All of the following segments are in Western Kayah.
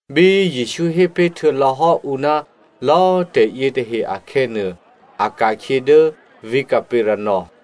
Bí Jesǔ hé pé̤ htuô̌lò̌ hò́ ǔ ná lò̌꤮ tè̤yětahe akhè̌nuô, a ka̤khyě dố vǐ̤ Capernaum.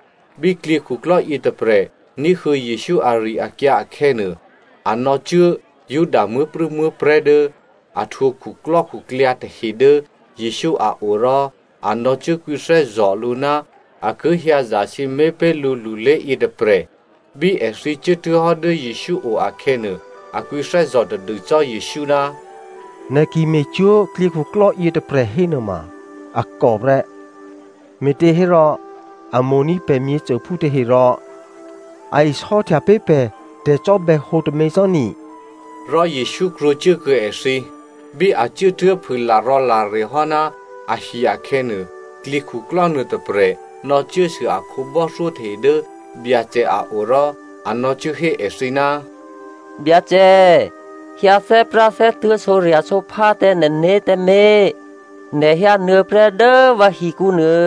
Bí klyěkhuklò́ yětôprè̤ ní̤huô̌ Jesǔ ari-akyǎ akhè̌nuô, a nò̌cuố Juda muố̤prû̌muố̤prè̤́ dố a htwǒ khuklò́khuklyǎ tahe dố Jesǔ a o rò a nò̌cuốkwǐthè́zò̤ lǔ ná a ki hyǎ zasǐmé̤ pé̤ lǔ lulé yětôprè̤. Bí èthǐ cuốtuố̤hò́ dố Jesǔ o akhè̌nuô, a kwǐthè́zò̤ tadû cò́ Jesǔ, “Nè̤ ki me̤cwó̤ klyěkhuklò́ yětôprè̤ hénuôma a kò prè́. Me̤těhérò a mo̤ní̤ pè̤ myěcôphú tahe, rò a isò́htya pé̤ pè̤ tè̤cò́bè̌hǒ tômě cò́ ni,” rò Jesǔ krwǒcuốkuô̌ èthǐ. Bí a cuốtuố̤ phû larò̌lare hò́ ná ahi akhè̌nuô, klyěkhuklò́ nuôtôprè̤ nò̌cuốsû a khǒbò́thyó tahe dố Byacè a o rò a nò̌cuốhé èthǐ, “Byacè꤮, hyǎ thè́práthè́tuô̤̌, sǒrya̤sǒphá tǎ nè̤né̤ tǎmé̤, nè̤ hyǎnuô̌prè́ dố vǎ hikǔnuô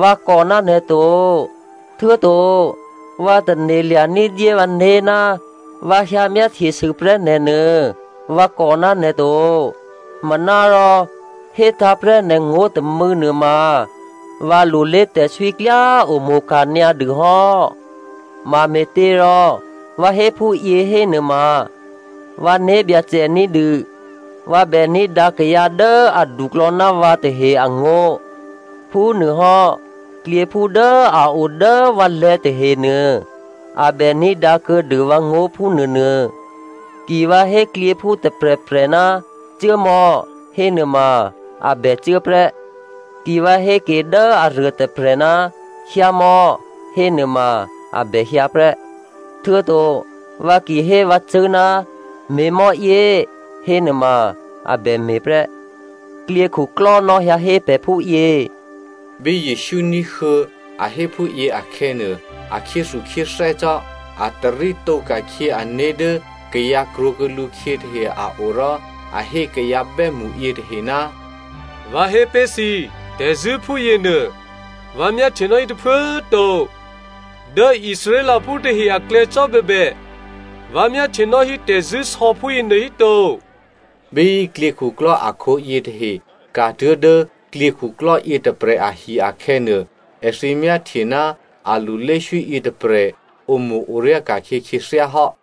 vǎ kò ná nè̤ to. Htuô̌to vǎ tane̤lya̤ ní̤dyé vǎné̤ ná vǎ hyǎmyáhtyesû prè́ nè̤ nuô vǎ kò ná nè̤ to. Manárò hétǎ̤ prè́ nè̤ngó̤ tômû̌ nuôma, vǎlulé tè̤swí klyá omo̤ka̤ nyǎ dû hò́. Mame̤těrò vǎ hé phúyě hénuôma vǎ né̤byacè ní̤dû vǎ bè ní̤dǎ kayǎ dố aduklò̌ ná vǎ tahe angó̤. Phúnuôhò́ klyěphú dố a o dố vǎlè̤̌ tahenuô a bè ní̤dǎkuô̌dû vǎngó̤ phúnuônuô. Ki vǎ hé klyěphú tôprè̤prè̤, ‘cuốmò̌,’ hénuôma a bècuố prè́, ki vǎ hé ke dố aruôtôprè̤, ‘hyǎmò̌,’ hénuôma a bè hyǎ prè́. Htuô̌to vǎ ki hé vǎcṳ̂́, ‘me̤mò̌yě,’ hénuôma a bè me̤ prè́, klyěkhuklò́ nò̌hyǎ hé pè̤ phúyě.” Bí Jesǔ ní̤huô̌ a hé phúyě akhè̌nuô, a khyéthukhyéthè́ cò́. A tarítǒ ka̤khyě ané̤ dố kayǎ krwǒkuô̌ lǔkhyě tahe a o rò a hé kayǎ bè́mṳ yětahe, “Vǎ hé pé̤ thǐ, tè̤zṳ̂́ phúyě nuô, vǎ myáhtyenò́ hí tôphuố꤮ to. Dố Israelphú tahe aklè̌ cò́bèbè, vǎ myáhtyenò́ hí tè̤zṳ̂́sò̌ phúyěnuô híto.” Bí klyěkhuklò́ akhǒ yětahe ka̤tuố̤ dố klyěkhuklò́ yětôprè̤ ahi akhè̌nuô, èthǐ myáhtye ná alulé swí yětôprè̤ omo̤-oryá ka̤khyě khyěthyá hò́.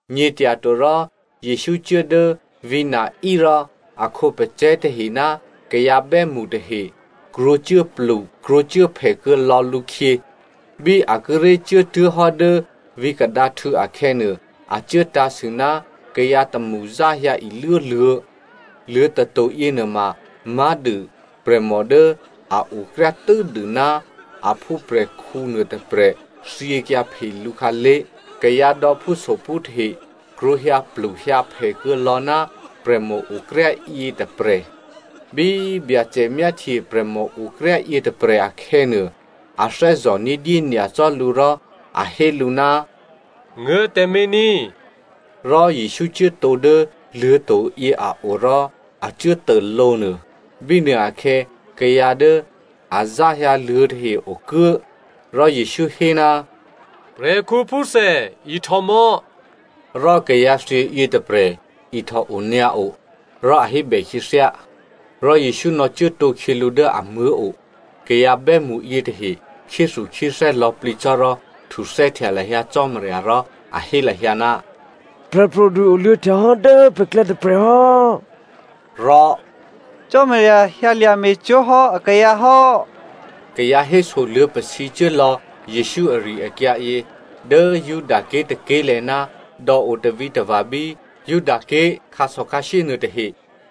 Nyě̤tyatorò, Jesǔ cuố dố vǐ̤ Nain rò a khǒpacè̤̌ tahe ná kayǎ bè́mṳ tahe krwǒcuốplu krwǒcuốphè kuô̌lò̌ lǔkhyě. Bí a kíré̤ cuốtuố̤hò́ dố vǐ̤ kadǎhtû̌ akhè̌nuô, a cuố tǎ̤sû ná kayǎ tômṳ záhyǎ iluốluô̤̌. Luô̤̌ tato̤ yěnuôma má̤dû prè̤mò dố a okryá tû́dû ná a phúprè̤khǔ nuôtôprè̤ thyěkyǎ phe lǔ khǎlé̤. Kayǎ dò̌phúsophú tahe krwǒ hyǎpluhyǎphè kuô̌lò̌ ná prè̤mòokryá yětôprè̤. Bí Byacè myáhtye prè̤mòokryá yětôprè̤ akhè̌nuô, a thè́zò̤ ní̤dyé nyacò́ lǔ rò a hé lǔ, “Nguố̤ tǎmé̤ ní꤮.” Rò Jesǔ cuốtǒ dố luô̤̌to̤ yě a o rò a cuốtô lǒnuô. Bínuôakhè̌ kayǎ dố a záhyǎ luô̤̌ tahe okuố. Rò Jesǔ hé, “Prè̤khǔphúthè ihtò mò̌.” Rò kayǎ thyě yětôprè̤ ihtòonyǎo, rò a hébè khyěthyá. Rò Jesǔ nò̌cuốtǒkhyě lǔ dố amuố̤ o. Kayǎ bè́mṳ yětahe khyéthukhyéthè́ lò̌plǐ cò́ rò htuthè́htya lahyǎ Cò́marya rò a hé lahyǎ, “Prè̤pro̤du oluô̌htya hò́ dố pè̤klè̌ tôprè̤ hò́” rò “Cò́marya hyǎlya̤ me̤cwó̤ hò́ akayǎ hò́.” Kayǎ hésoluô̌ pasǐcuố lò̌ Jesǔ ari-akyǎyě dố Judaké̤ tôké̤lè̤̌ ná dò̌ o tavǐtava̤ bí Judaké̤ khǎsò̌khǎshyé nuôtahe.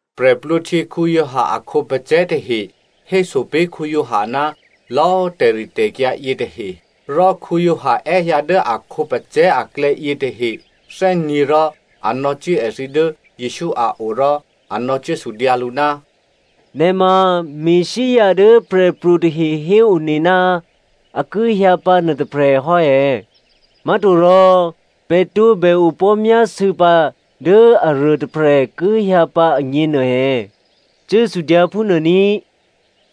Giovanni Baptista a khǒpacè̤̌ tahe héso pé̤ Giovanni ná lò̌꤮ tè̤ritè̤kyǎ yětahe. Rò Giovanni è́hyǎ dố a khǒpacè̤̌ aklè̌ yětahe thè́nyě̤ rò a nò̌cuố èthǐ dố Jesǔ a o rò a nò̌cuốsudyǎ lǔ, “Nè̤ ma Messia dố prè̤pro̤ tahe héone ná a ki hyǎ pǎ nuôtôprè̤ hò́ è̌? Má̤torò pè̤ tǒbè opò̤́myásû̌pǎ dố aruôtôprè̤ ki hyǎ pǎ agně nuô è̌? Cuốsudyǎ phúnuô ní,”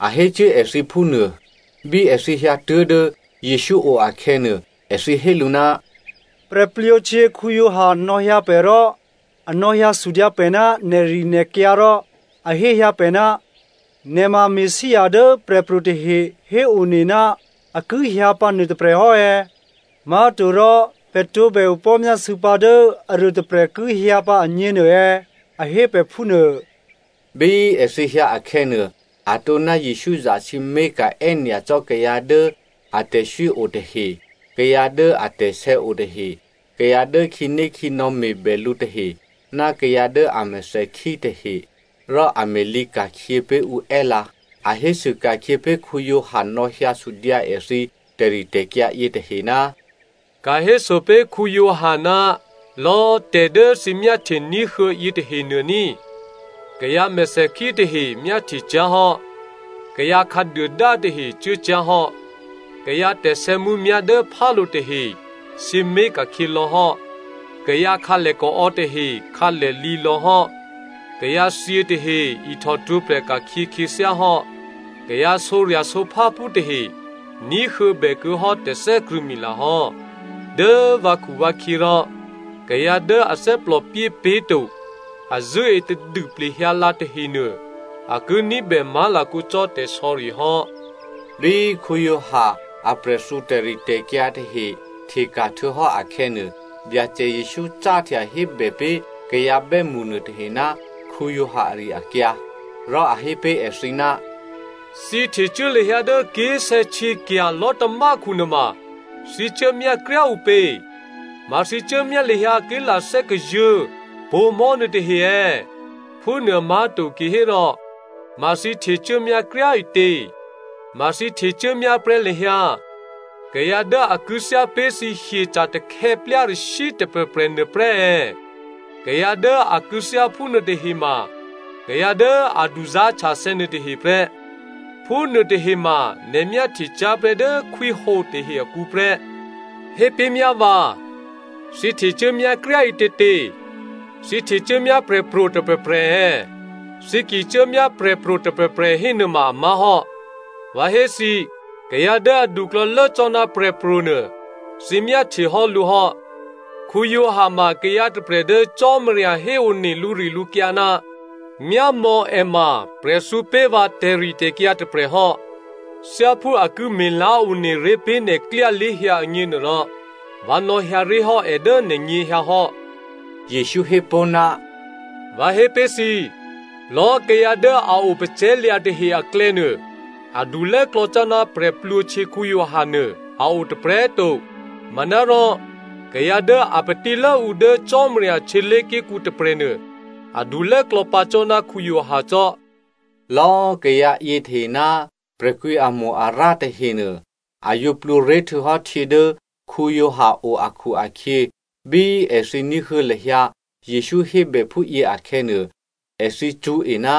a hécuố èthǐ phúnuô. Bí èthǐ hyǎtuố̤ dố Jesǔ o akhè̌nuô, èthǐ hé lǔ, “Giovanni Baptista nò̌hyǎ pè̤ rò a nò̌hyǎsudyǎ pè̤ ná nè̤rinè̤kyǎ rò a hé hyǎ pè̤, ‘Nè̤ ma Messia dố prè̤pro̤ tahe héone ná a ki hyǎ pǎ nuôtôprè̤ hò́ è̌? Má̤torò pè̤ tǒbè opò̤́myásû̌pǎ dố aruôtôprè̤ ki hyǎ pǎ agně nuô è̌? A hé pè̤ phúnuô.’” Bí èthǐ hyǎ akhè̌nuô, atǒ ná Jesǔ zasǐmé̤ka̤ è́nyacò́ kayǎ dố atè̤swí o tahe, kayǎ dố atè̤sè̌ o tahe, kayǎ dố khǐnékhǐnò̌ me̤bè lǔ tahe ná kayǎ dố a mèthèkhí tahe rò a me̤lǐka̤khyě pé̤ ǔ è́lǎ. A hésû ka̤khyě pé̤ Giovanni nò̌hyǎ sudyǎ èthǐ tè̤ritè̤kyǎ yětahe, “Ka̤héso pé̤ Giovanni ná lò̌꤮ tè̤ dố thǐ myáhtye ní̤huô̌ yětahenuô ní꤮. Kayǎ mèthèkhí tahe myáhtye cyá̤hò́, kayǎ khǎduôdá tahe cuốcyá̤hò́, kayǎ tè̤sè̌mǔmyá̤ dố phálo̤ tahe sǐmé̤ ka̤khyě lò̌hò́, kayǎ khǎlèkaò̌ tahe khǎlèlǐ lò̌hò́, kayǎthyě tahe ihtòhtwǒprè̤ ka̤khyě khyěthyáhò́, kayǎ sǒrya̤sǒpháphú tahe ní̤huô̌bè kuô̌hò́ tè̤thè́krṳ̂̌mila hò́. Dố vǎkhuvǎkhyě rò kayǎ dố a thè́plòpyé pé̤to, a zṳ̂́e tadû plehyǎlǎ tahenuô a ki ní̤bè má̤lakǒ cò́ tè̤sò̌ri hò́.” Bí Giovanni aprè̤thǔ tè̤ritè̤kyǎ tahe hteka̤ htuô̌hò́ akhè̌nuô, Byacè Jesǔ cáhtya hébè pé̤ kayǎ bè́mṳ nuôtahe ná Giovanni ari-akyǎ. Rò a hé pé̤ èthǐ, “Thǐ htecuố lahyǎ dố ké̤sè̌htyěkya̤ lò̤́tamákhu nuôma, thǐ cuốmyá kryá꤮ ǔpě? Ma thǐ cuốmyá lahyǎ ké̤lathè́ kazuô̤̌ pǒ̤mò̤́ nuôtahe è̌? Phúnuô má̤to kihérò, ma thǐ htecuốmyá kryá꤮ ǐtě? Ma thǐ htecuốmyá prè́ lahyǎ kayǎ dố a kû̌thyá pé̤ thǐ hyeca̤ takhè̌plyarashyǐ tôprè̤prè̤ nuôprè́ è̌? Kayǎ dố a kû̌thyá phúnuô tahema kayǎ dố a duzá̤htyathè̌ nuôtahe prè́, phúnuô tahe ma nè̤ myáhtye cyá̤ prè́ dố khwíhǒ tahe akǔ prè́. Hépé̤myá vǎ, thǐ htecuốmyá kryá꤮ ǐtětě? Thǐ htecuốmyá prè̤pro̤ tôprè̤prè̤ è̌? Thǐ ki cuốmyá prè̤pro̤ tôprè̤prè̤ hénuôma a má̤hò́. Vǎ hé thǐ, kayǎ dố aduklò̌lố cò́ ná prè̤pro̤nuô, thǐ myáhtye hò́ lǔ hò́. Giovanni ma kayǎ tôprè̤ dố Cò́marya héone lǔrilǔkyǎ, ‘Myámò̌ è ma prè̤thǔ pé̤ vǎ tè̤ritè̤kyǎ tôprè̤hò́, thyáphú a ki me̤lá̤ one ré̤ pé̤ nè̤klyá lé̤hyǎ agněnuôrò, vǎ nò̌hyǎ ré̤hò́ è dố nè̤nyěhyǎ hò́.’” Jesǔ hé pó̤, “Vǎ hé pé̤ thǐ, lò̌꤮ kayǎ dố a opacè̤̌lya̤ tahe aklè̌nuô, adulốklò̌ cò́ ná prè̤plwǒhtyě Giovanni a o tôprè̤꤮ to. Manárò kayǎ dố a patílốǔ dố Cò́marya htyělé̤ké̤kǔ tôprè̤nuô, adulốklò̌ pǎ cò́ ná Giovanni cò́.” Lò̌꤮ kayǎ yětahe ná prè̤kwǐamo-arǎ tahenuô a yǒ plwǒré̤ htuô̌hò́ htyě dố Giovanni o akhu-akhyě, bí èthǐ ní̤huô̌ lahyǎ Jesǔ hébè phúyě akhè̌nuô, èthǐ cṳ̌e ná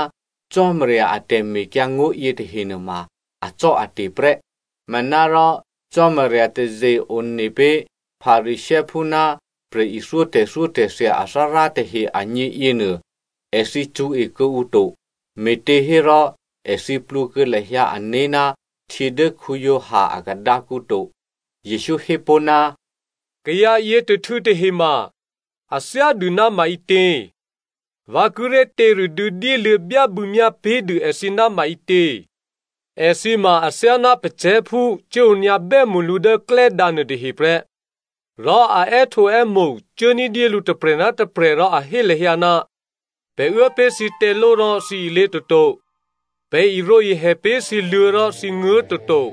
Cò́marya a tè̤mekyǎngó̤ yětahe nuôma acò́ate̤ prè́. Manárò Cò́marya taze-one pé̤ Pharisěophú ná prè̤ithyó tè̤thyótè̤thya athárá tahe agně yěnuô, èthǐ cṳ̌e kuô̌ǔ to me̤těhérò èthǐ plwǒ kuô̌ lahyǎ ané̤ ná htyě dố Giovanni a khadǎkǔ to. Jesǔ hé pó̤, “Kayǎ yětôhtû̌ tahe ma, a thyádû ná maǐtě? Vǎ kíré̤ těradû̌ dyéluô̌ byábû̌myá pé̤dû èthǐ ná maǐtě? Èthǐ ma athyáná pacè̤̌phú cuốonyǎ bè́mṳlǔ dố klè́dǎ nuôtahe prè́. Rò a è́htǒè́mo̤ cuố ní̤dyé lǔ tôprè̤ ná tôprè̤ rò a hé lahyǎ, ‘Pè̤ uố pé̤ thǐ těló rò thǐ ilě toto, Pè̤ irǒihè pé̤ thǐ luô̤̌ rò, thǐ nguố̤ toto.’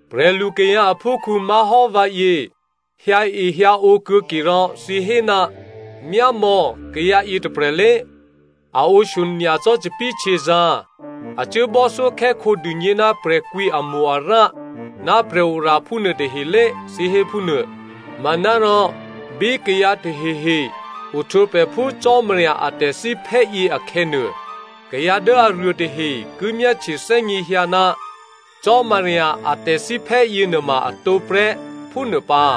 Prè̤lukayǎ aphúkhǔ má̤hò́ vǎyě hyǎehyǎǒ kuô̌ke rò thǐ hé, ‘Myámò̌ kayǎ yětôprè̤lé, a ǒshyo nyacò́ thòbǐthèhtyězǎ̤, a cuố bò́thyókhè́khǒ dûgně ná prè̤kwǐamo-arǎ ná prè̤oraphú nuôtahelé,’ thǐ hé phúnuô. Manárò bí kayǎ tahehe ohtwǒprè̤ phú Cò́marya a tè̤thíphè́ yěakhè̌nuô, kayǎ dố aruô tahe ki myáhtye thè́gněhyǎ ná Cò́marya a tè̤thíphè́ yěnuôma a tǒprè́, phúnuô pǎ.”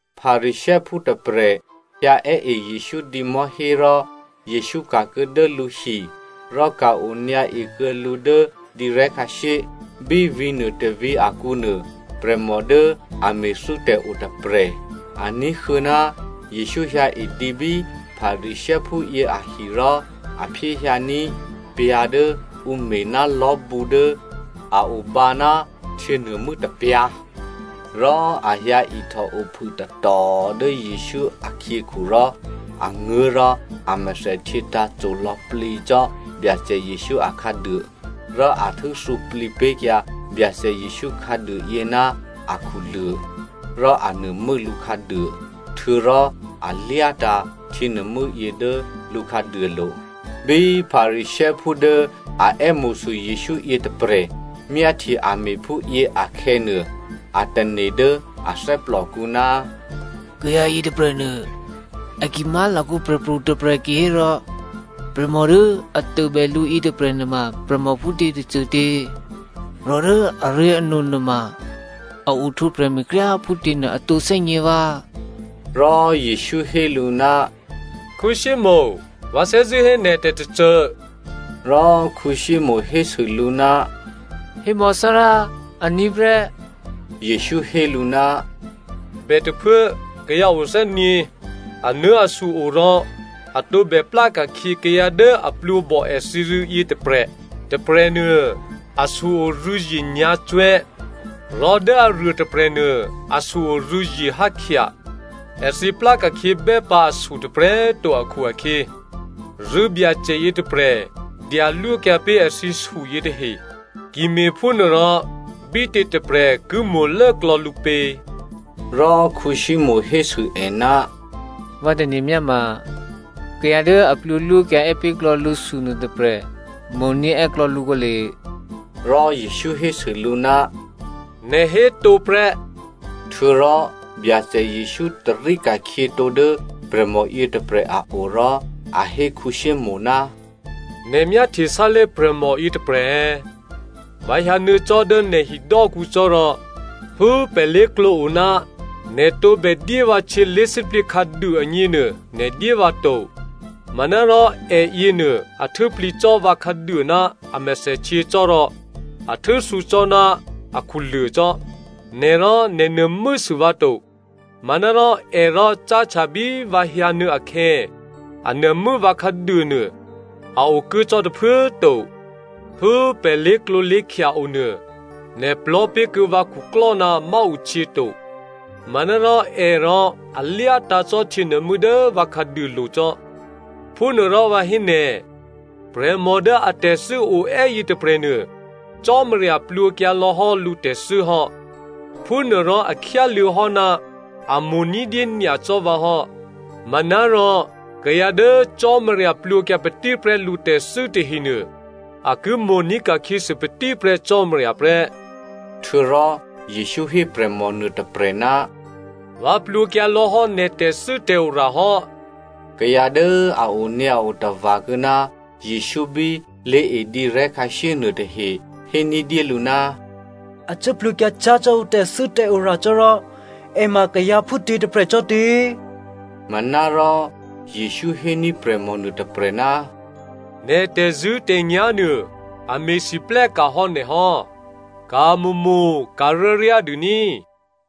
Pharisěophú tôprè̤ hyǎè́e Jesǔ dǐmò̤́hé rò Jesǔ ka̤kuô̌ dố lǔhi rò ka̤-onyǎ ekuô̌ lǔ dố dǐrè̤́ khǎshyé. Bí vǐ̤ nuôtôvǐ̤ akǔnuô prè̤mò dố a me̤thû́tè̤ otôprè̤. A ní̤huô̌ ná Jesǔ hyǎedǐ bí Pharisěophúyě ahi rò a phyéhyǎní̤ pyǎ̤ dố ǔ me̤ ná lò̤́bǔ dố a obǎ ná htyěnuô̤mû́ tôpyǎ̤. Rò a hyǎihtòo phûtatò dố Jesǔ akhyěkhu rò a nguố̤ rò a mèthèhtyě tǎ̤co lò̌plǐ cò́ Byacè Jesǔ akhǎduô. Rò a htû́thǔplǐ pé̤kyǎ Byacè Jesǔ khǎduôyě ná akhuluô̤, rò a nuô̤mû́ lǔ khǎduô. Htuô̌rò a lyátǎ̤ htyěnuô̤mû́yě dố lǔ khǎduôlo̤. Bí Pharisěophú dố a è́mo̤sû Jesǔ yětôprè̤ myáhtye a me̤phúyě akhè̌nuô, a tane̤ dố a thè́plòkǔ, “Kayǎ yětôprè̤nuô, a ki má̤lakǒ prè̤pro̤ tôprè̤ kihérò, prè̤mò dố a tôbè lǔ yětôprè̤ nuôma prè̤mò phútě tôcôtě, rò dố aré̤ano nuôma a ohtwǒprè̤ me̤kryá꤮ phútěnuô a tǒ thè́gně vǎ,” Rò Jesǔ hé lǔ, “Simonè, vǎ thè́zṳ̂́ hé nè̤ tè̤tôcô.” Rò Simonè hésû lǔ, “Hémò̌ Thárá, aní̤ prè́.” Jesǔ hé lǔ, “Bètôphuố kayǎ othè́nyě̤, anuố̤asu o rò a tǒbè pláka̤khyě kayǎ dố a plwǒbò èthǐ rû̌ yětôprè̤. Tôprè̤nuô asu-o rû̌zye nyǎ̤cwè̤́, rò dố aruô tôprè̤nuô asu-o rû̌zye hákhya. Èthǐ plá ka̤khyěbè́ pǎ asu tôprè̤꤮ to akhu-akhyě rû̌byacè yětôprè̤ dyalwókyǎ pé̤ èthǐsu yětahe. Ki me̤phúnuôrò, bítě tôprè̤ ki mo̤lốklò̌ lǔ pě?” Rò Simonè hésû è, “Vǎ tane̤ myáma, kayǎ dố a plwǒlwókyǎ è́ pé̤klò̌ lǔsu nuôtôprè̤ mo̤ní̤ è́klò̌ lǔ kǒle.” Rò Jesǔ hésû lǔ, “Nè̤ hé tǒ prè́.” Htuô̌rò Byacè Jesǔ tarí ka̤khyětǒ dố prè̤mò yětôprè̤ a o rò a hé Simonè, “Nè̤ myáhtye sálé̤ prè̤mò yětôprè̤ è̌? Vǎ hyǎnuô̌ cò́ dố nè̤ hidò́kǔ cò́ rò, phú pè̤ lé̤klǒ o ná nè̤ tǒbè dyé vǎ htyě lé̤sǐplǐ khǎduô agněnuô nè̤ dyé vǎ to. Manárò èyěnuô a htû́plǐ cò́ vǎ khǎduô ná a mèthèhtyě cò́ rò a htû́thǔ cò́ ná akhuluô̤ cò́. Nè̤ rò nè̤ nuô̤mû́sû vǎ to, manárò è rò cáhtya bí vǎ hyǎnuô̌ akhè̌, a nuô̤mû́ vǎ khǎduônuô a okuố cò́ tôphuố꤮ to. Phú pè̤ lé̤klǒlé̤khya onuô, nè̤ plò̤́ pé̤kuô̌ vǎ khuklò́ ná máǔhtyě to, manárò è rò a lyátǎ̤ cò́ htyěnuô̤mû́ dố vǎ khǎduôlo̤ cò́. Phúnuôrò vǎ hé nè̤, prè̤mò dố atè̤thû́ oè́ yětôprè̤nuô, Cò́marya plwǒkyǎ lò̌hò́ lǔtè̤thû́ hò́. Phúnuôrò a khyáluô̌ hò́ ná a mo̤ ní̤dyé nyacò́ vǎ hò́. Manárò kayǎ dố Cò́marya plwǒkyǎ patí prè́ lǔtè̤thû́ tahenuô a ki mo̤ní̤ ka̤khyěsû patíprè́ Cò́marya prè́.” Htuô̌rò Jesǔ hé prè̤mò nuôtôprè̤, “Vǎ plwǒkyǎ lò̌hò́ nè̤ tè̤thû́tè̤ora hò́.” Kayǎ dố a onyǎo tava̤kuô̌ ná Jesǔ bí lé̤edǐrè̤́ khǎshyé nuôtahe hé ní̤dyélǔ, “A cuố plwǒkyǎ cyá̤ cò́ ǔ tè̤thû́tè̤ora cò́ rò è ma kayǎ phútě tôprè̤ cò́tě?” Manárò Jesǔ héní̤ prè̤mò nuôtôprè̤, “Nè̤ tè̤zṳ̂́tè̤nyá̤ nuô, a me̤lwóhteka̤ hò́ nè̤ hò́. Ka̤mo̤mo̤ ka̤ryáryá dû ní꤮.”